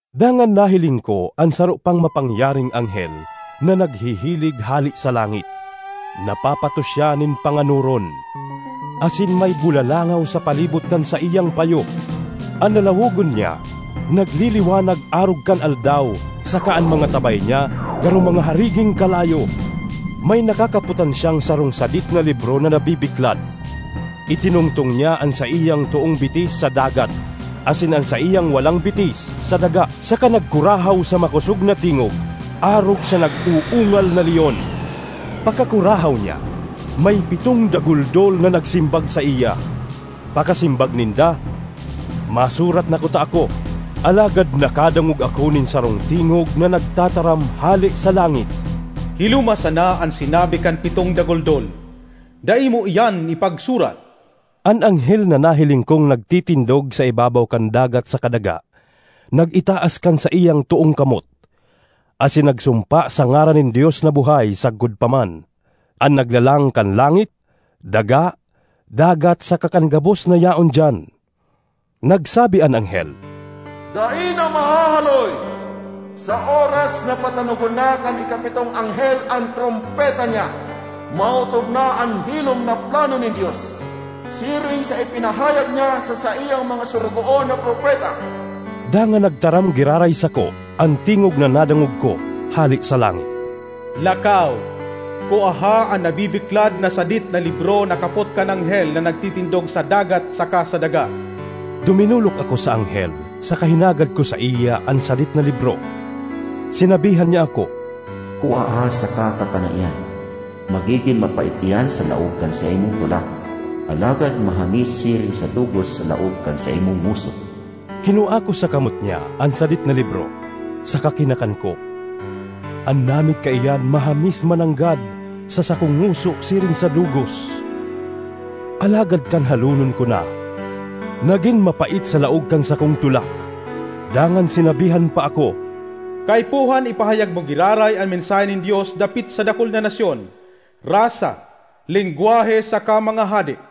Dangan nahiling ko an saro pang mapangyaring anghel na naghihilig hale sa langit. Napapatos siya nin panganoron, asin may bulalangaw sa palibot kan saiyang payo. An lalawogon niya nagliliwanag arog kan aldaw saka an mga tabay niya garo mga hariging kalayo. May nakakapotan siyang sarong sadit na libro na nabibiklad. Itinungtong niya an saiyang toong bitis sa dagat asin an saiyang walang bitis sa daga, saka nagkurahaw sa makosog na tingog arog sa nag-uungal na leon. Pakakurahaw niya, may pitong daguldol na nagsimbag saiya. Pakasimbag ninda, masurat na kuta ako, alagad nakadangog ako nin sarong tingog na nagtataram hale sa langit, “Hiloma sana an sinabi kan pitong daguldol; dai mo iyan ipagsurat!” An anghel na nahiling kong nagtitindog sa ibabaw kan dagat saka daga nag-itaas kan saiyang toong kamot, asin nagsumpa sa ngaran nin Dios na buhay sagkod pa man, an naglalang kan langit, daga, dagat saka kan gabos na yaon diyan. Nagsabi an anghel, “Dai na mahahaloy! Sa oras na patanogon na kan ikapitong anghel an trompeta niya, maootob na an hilom na plano nin Dios, siring sa ipinahayag niya sa saiyang mga sorogoon na propeta.” Dangan nagtaram giraray sako an tingog na nadangog ko hale sa langit, “Lakaw, kuaha an nabibiklad na sadit na libro na kapot kan anghel na nagtitindog sa dagat saka sa daga.” Duminolok ako sa anghel saka hinagad ko saiya an sadit na libro. Sinabihan niya ako, “Kuaha saka kakana iyan. Magigin mapait iyan sa laog kan saimong tulak, alagad mahamis siring sa dugos sa laog kan saimong ngoso.” Kinua ko sa kamot niya an sadit na libro saka kinakan ko. An namit kaiyan mahamis mananggad sa sakong ngoso siring sa dugos, alagad kan halonon ko na, nagin mapait sa laog kan sakong tulak. Dangan sinabihan pa ako, “Kaipuhan ipahayag mo giraray an mensahe nin Dios dapit sa dakul na nasyon, rasa, lengwahe saka mga hade.”